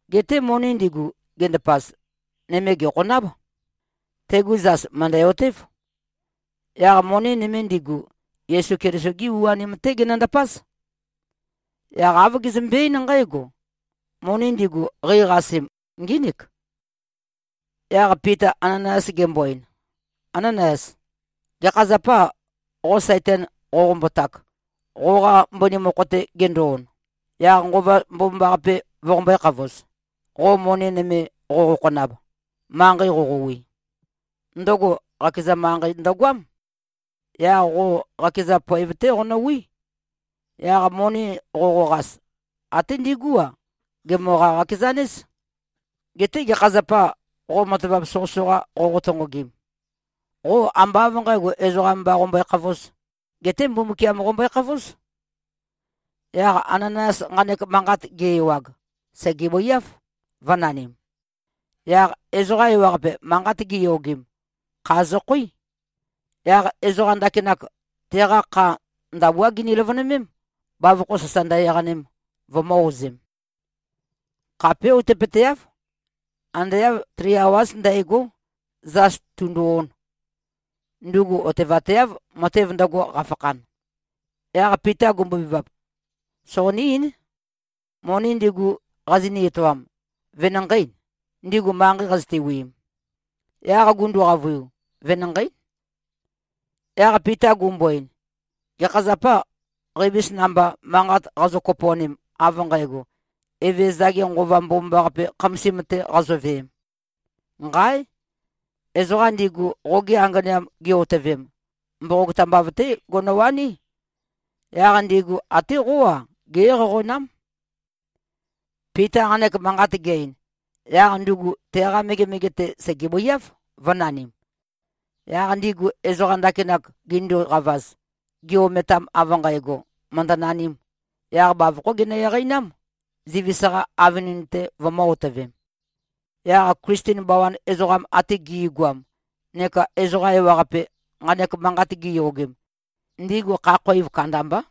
Geté moni ndigu, gendapaz, nøme gèkhonáb. Tegu zas mø̀ndæ-otév. Yaq moni nøme ndigu, Yesu Keliso-gí u-anim-té genøndapáz. Yaq āv gezømbe-eín nqǽgo, “Moni ndigu, qeiqasem, ngínik.” Yaq Pita Ananayas gembo-ein, “Ánanayas. Gekha zapâ, qo Saitan qoqombotak, qoqa mbøni mokho-te gendo-on, yaq Nqova Mbomambaqape voqombø̄e-khavoz, qo moni nøme qoqokhonab, manqei qoqowi. Ndøgo qakeza manqei ndøgoám. Yaq qo qakeza poev-té qonøwí. Yaq moni qoqoqas, até ndigú-a, gemøqa-qakezanéz. Geté gekha zapâ, qo matavap soqøsoqa qoqo-tonqogim? Qo ambá av nqǣgo, ezoqa mba qombøekhavōz. Geté Mbumbukiam qombøekhavóz.” Yaq Ananayas nqanek manqat ge-ewag, sègebøiáv, vø̄nanim. Yaq ezoqa ewaqape, manqat giyogem, kha zøkhoí. Yaq ezoqa ndakinak, teqa kha ndabuá gini-løvønømém, bavokho sasa ndø-eqanem, vømø̄-ozem. Khapé outøpøteáv. Ande āv tri awáz ndægó, zas tūndū-ōn. Ndugu otevateáv, matev ndøgo, qafakhan. Yaq Pita gumbobevap, “Soqoní-eín. Moni ndigu qazoni-etoam, venanqeî, ndigu manqei qazøte-wiim?” Yaq gundu-qavøiu, “Venanqeí.” Yaq Pita gumbo-ein, “Gekha zapâ, qeivis namba, manqat qazo-kopo꞉nem av nqægo, Evezøza-ge Nqova Mbomambaqape khamasim-te qazoveem? Nqáe! Ezoqa ndigu, qoge anganeam gi-otøvem, mboqog tambav-té gonowaní. Yaq ndigu até qó-a, gé-eqæqonám.” Pita nqanek manqat ge-ein, yaq ndugu teqa megemege-te sègebøiáv, vø̄nanim. Yaq ndigu ezoqa ndakinak ginduqavaz, gi-ometam av nqægo, mø̀ndønanīm, yaq bavokhó ginø-eqeinám, zivis-qa avønin-te vømø̄-otøvem. Yaq Klisten bawan ezoqam ate gi꞉goam neka ezoqa ewaqape, nqanek manqat giyogem, ndigu kha-khoiv kandambá.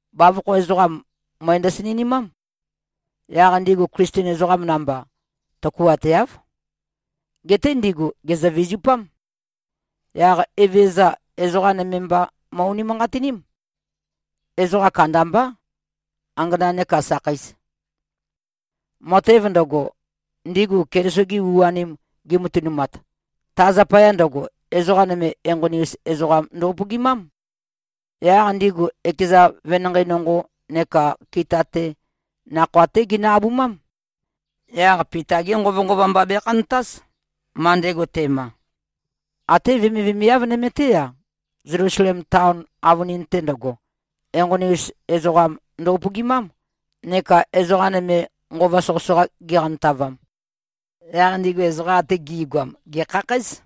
Bavokho ezoqam, møe ndøsinønimám. Yaq ndigu Klisten ezoqam namba, tøkuateáv. Geté ndigu gèzø-vizupám. Yaq Evezøza, ezoqa nøme mba mo꞉-unimanqatiním. Ezoqa kandambá. Angana nekā sakheis. Matev ndøgo, ndigu Keliso-gi u-anim gimatønumat, ta zapaya ndøgo, ezoqa nøme enqoni-us ezoqam ndo-upøgimám. Yaq ndigu ekeza venanqei nonqo neka kita-te, nakhoa-té ginø-abumám. Yaq Pita-gé nqovønqova mba bekhantáz, ma ndego te꞉ma. Até vemivemiav nøme-té-a, Zelusalem taon avønin-te ndøgo, enqoni-us ezoqam ndo-upøgimám, neka ezoqa nøme, nqova soqøsoqa giqantavam. Yaq ndigu ezoqa ate gi꞉goam, gèkhakhǽz.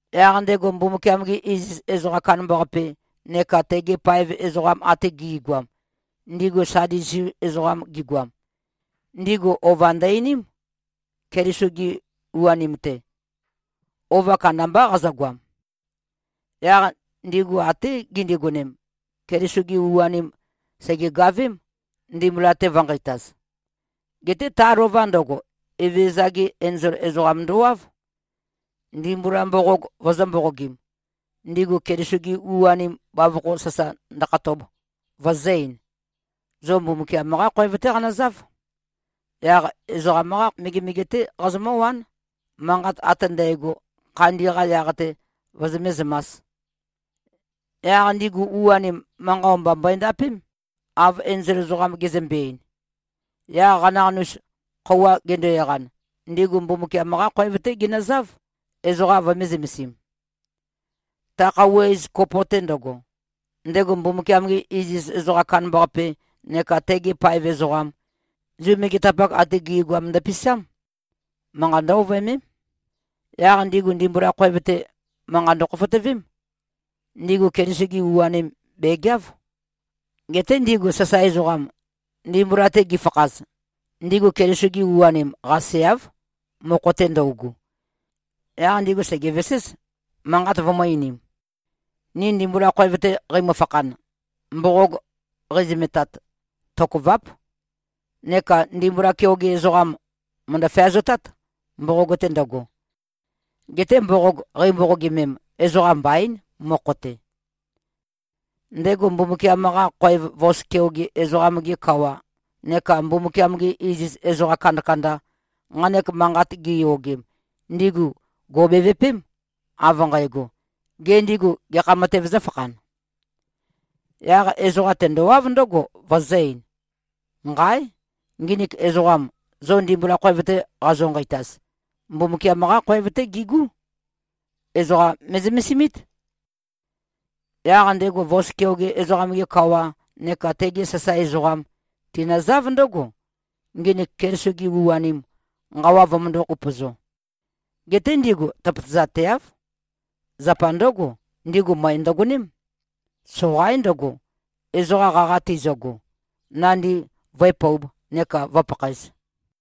Yaq ndego Mbumbukiam-ge iziz ezoqam kandambaqape neka tegi paev ezoqa ate gi꞉goam, ndigu Sadusi ezoqam gigoam, ndigu ova ndø-einím, Keliso-gi u-anim-te. Ova kandambá qazøgoam. Yaq ndigu até gindigonem, Keliso-gi u-anim sègegavém, ndimbula-te vø̄nqeitaz. Geté ta lova ndøgo, Evezøza-ge enzol ezoqam ndowáv, ndimbula mboqog vøzø̄-mboqogim, ndigu Keliso-gi u-anim bavokho sasa ndøkhatob, vøzø̄-ein, “Zo Mbumbukiam-qá khoev-té qanøzáv. Yaq ezoqam-qá megemege-té qazomǿwán, manqat ate ndægo, khandi-qa yaq-te, vozomé-zømās.” Yaq ndigu u-anim, manqa o-mba mbøendapém, av enzol ezoqam gezømbe-ein. Yaq qanaqanus, khøuwa gendo-eqan, ndigu Mbumbukiam-qá khoev-té ginøzáv, ezoqa vømē-zømesim. Ta khøuwa iz kopo-te ndøgo, ndego Mbumbukiam-ge iziz ezoqam kandambaqape neka tegi paev ezoqam, Zu megetapak ate gi꞉goam ndøpisám. Manqa ndǿ-ovøemém. Yaq ndigu ndimbula khoev-te, manqat ndøkhofotøvém. Ndigu Keliso-gi u-anim, bègeáv. Geté ndigu sasae ezoqam, ndimbula-te gifakhaz, ndigu Keliso-gi u-anim qaseáv, mokho-te ndøugu. Yaq ndigu sègeveséz, manqat vømø̄-einim, “Ni ndimbula khoev-te qeimø-fakhan, mboqog qeizømetat, tokøváp. Neka ndimbula keoge ezoqam mòndo-feazotát, mboqog-te ndøgo. Geté mboqog qeimboqogimem, ezoqam mbaín, mokho-te.” Ndego Mbumbukiam-qa khoev vos keoge ezoqam-ge kawa neka Mbumbukiam-gi iziz ezoqa kandakanda, nqanek manqat giyogem, ndigu gò꞉bevupém, av nqægo, “Gê, ndigu gekha matēv zǿfakhan?” Yaq ezoqam tendowáv ndǿgo, vøzø̄-ein, “Nqáe! Nginik ezoqam, zo ndimbula khoev-te qazo-nqeitaz, Mbumbukiam-qá khoev-té gigú. Ezoqa me꞉zømesimít.” Yaq ndego vos keoge ezoqam-ge kawa neka tegi sasae ezoqam, tinøzáv ndǿgo, nginik Keliso-gi u-anim, nqawa vømøndō-upøzo. Geté ndigu tøpøtøzateáv. Zapa ndǿgo, ndigu møe ndøgoném. Soqaín ndøgo, ezoqa qaqa tizøgo, nandi vǿepōub, neka vǿpakhaēz.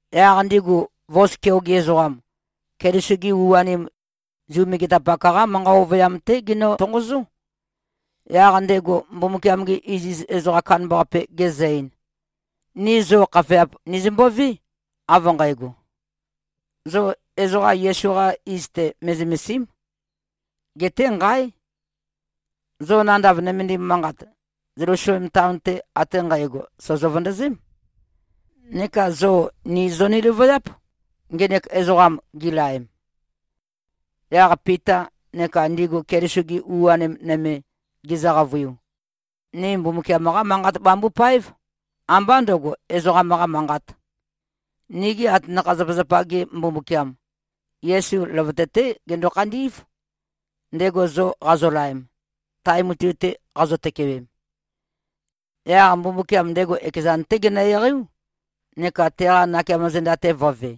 Yaq ndigu vos keoge ezoqam, Keliso-gi u-anim, Zu megetapak-qá manqa ovøyam-té ginø-tonqozó. Yaq ndego Mbumbukiam-ge iziz ezoqam kandambaqape gezø-ein, “Ni zo khafeap nizømbové, av nqægo, ‘Zo ezoqa Yesu-qa iz-te me꞉zømèsi᷄m.’ Geté nqáe! Zo nandav nømendim manqat, Zelusalem taon-te ate nqægo, sòzo-vøndøzém. Neka zo nī zoni-løvøyáp, ngenek ezoqam gilaem.” Yaq Pita neka ndigu Keliso-gi u-anim nøme gizø-qavøiu, “Ni Mbumbukiam-qá manqat bambupáev, ambá ndø̄go, ezoqam-qa manqat. Nigi atanakha-zapazapa-za-ge Mbumbukiam, Yesu løvøte-té gendo-khandí꞉v, ndego zo qazolaem, tae mutui-te qazo-tøkewem. Yaq Mbumbukiam ndego ekezan-té genø-eqeiú, neka teqa nakeamo zenda-te vø̄ve.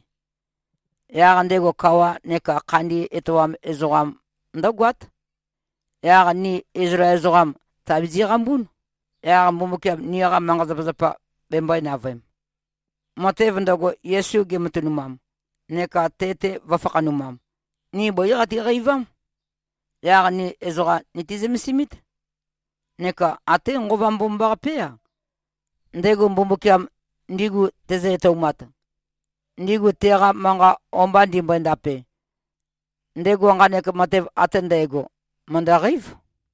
Yaq ndego kawa neka khandi etoam ezoqam ndǿgoát. Yaq ni Izlael ezoqam tàbizi꞉-qambún, yaq Mbumbukiam niqa manqa-zapazapa bembøē-navøem. Matev ndøgo, Yesu gematønumam neka te-te vø̄fakhanumam, ni bǿi qatiqeivám. Yaq ni ezoqa niti-zømesimít. Neka até Nqova Mbomambaqapé-a, ndego Mbumbukiam ndigu tezø-etoumat, ndigu teqa manqa o-mba ndimbøe-ndape, ndego nqanek matev ate ndægo mø̀ndøqeív.”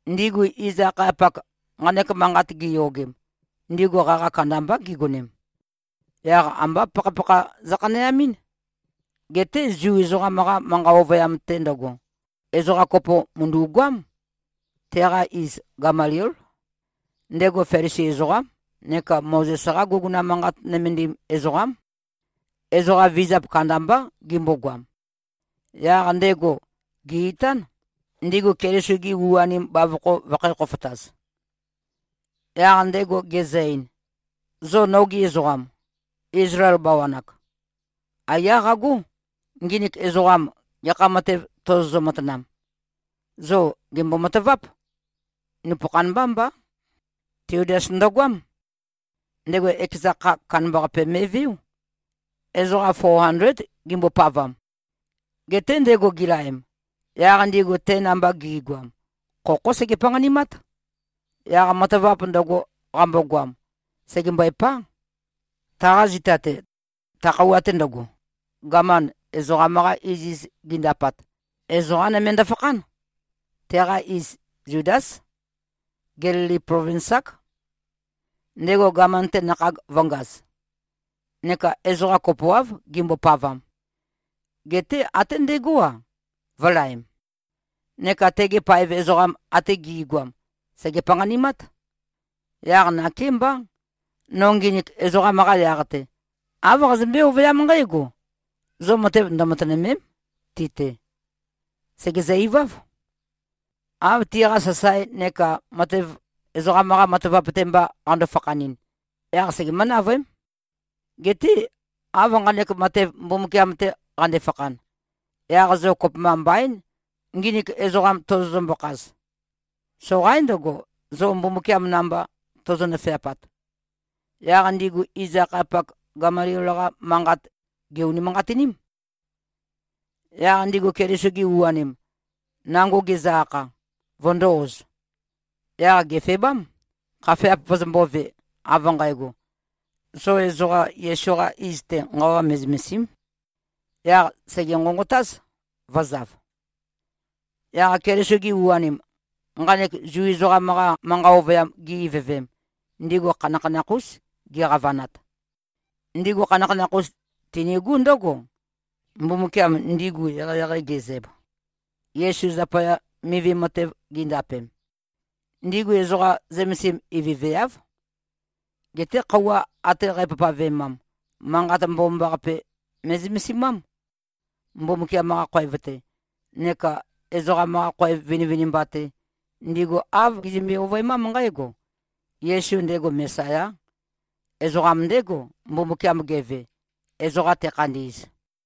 Ndigu iz-akhayapak, nqanek manqat giyogem, ndigu qaqa kandambá gigonem. Yaq ambá pakhapakha zøkhaneamɨ́n. Geté Zu ezoqam-qa manqa ovøyam-te ndøgo, ezoqa kopo mø̀ndu꞉goám. Teqa iz, Gamaliél. Ndego Felisi ezoqám neka Mozes-qá guguna manqat nømendim ezoqám. Ezoqa vizap kandambá gimbogoam. Yaq ndego gè-itán, ndigu Keliso-gi u-anim bavokho vøkhǣ-khofotaz. Yaq ndego gezø-ein, “Zo nogi ezoqam, Izlael bawan-ak. Aiyá qagó, nginik ezoqam gekha matev tozozø-matanam. Zo gèmbo-mataváp. Nupøkhan mbá mbá. Tiudas ndøgoám. Ndego ekeza kha, kandambaqape me꞉veó. Ezoqa fo andléd gimbopavam. Geté ndego gilaem, yaq ndigu te namba gi꞉goam, khokhó sege-panqanimát. Yaq matavap ndøgo, qambogoam, sègembøepá. Taqa zita-te, ta khøuwa-te ndøgo, gaman, ezoqam-qa iziz gindapat, ezoqá nøme ndøfakhán. Teqa iz Zudás. Gelili plovins-ák. Ndego gaman-te nakhag vø̄ngaz. Neka ezoqa kopoáv gimbopavam. Geté até ndégo-a, vø̄laem. Neka tegi paev ezoqam ate gi꞉goam, sège-panqanimát. Yaq nakémbá. No nginik ezoqam-qa yaq-te, āv qazømbé-ovøyám nqǽgo: Zo matev ndømatønø̀me᷄m, ti-te. Sègezø-iváv. Av tiqa sasae neka matev ezoqam-qa matavap-te mba qando-fakhanɨn, yaq segemǿ-navøém. Geté, av nqanek matev Mbumbukiam-te qande-fakhan, yaq zo kopømba mbaín, nginik ezoqam tozozømbø-khaz. Soqaín ndøgo, zo Mbumbukiam namba tozo-nøfeapat.” Yaq ndigu iz-akhayapak, Gamaliel-qa manqat, gè-unimanqatiním. Yaq ndigu Keliso-gi u-anim, nango gizø-akha, vøndō-oz. Yaq gèfebám, khafeap vøzømbōve, av nqægo, “Zo ezoqa Yesu-qa iz-te, nqawa me꞉zømèsi᷄m.” Yaq sège-nqonqotáz, vø̄zav. Yaq Keliso-gi u-anim, nqanek Zu ezoqam-qa manqa ovøyam gi-ivøvem, ndigu khanakhanakh-ús giqavanat. Ndigu khanakhanakh-us tinigú ndǿgo, Mbumbukiam ndigu eqeieqei ge꞉zæb, Yesu zapaya mivi matev gindapem. Ndigu ezoqa zømesim ivøveáv. Geté khøuwa ate qæpavpavemam, Manqat Mbomambaqape me꞉zømesimám. Mbumbukiam-qa khoev-te neka ezoqam-qa khoev vinivinimba-te, ndigu āv gizømbe-ovøemám nqǽgo: Yesu, ndego Mesayá. Ezoqam ndégo, Mbumbukiam geve, ezoqa tekhandi꞉z.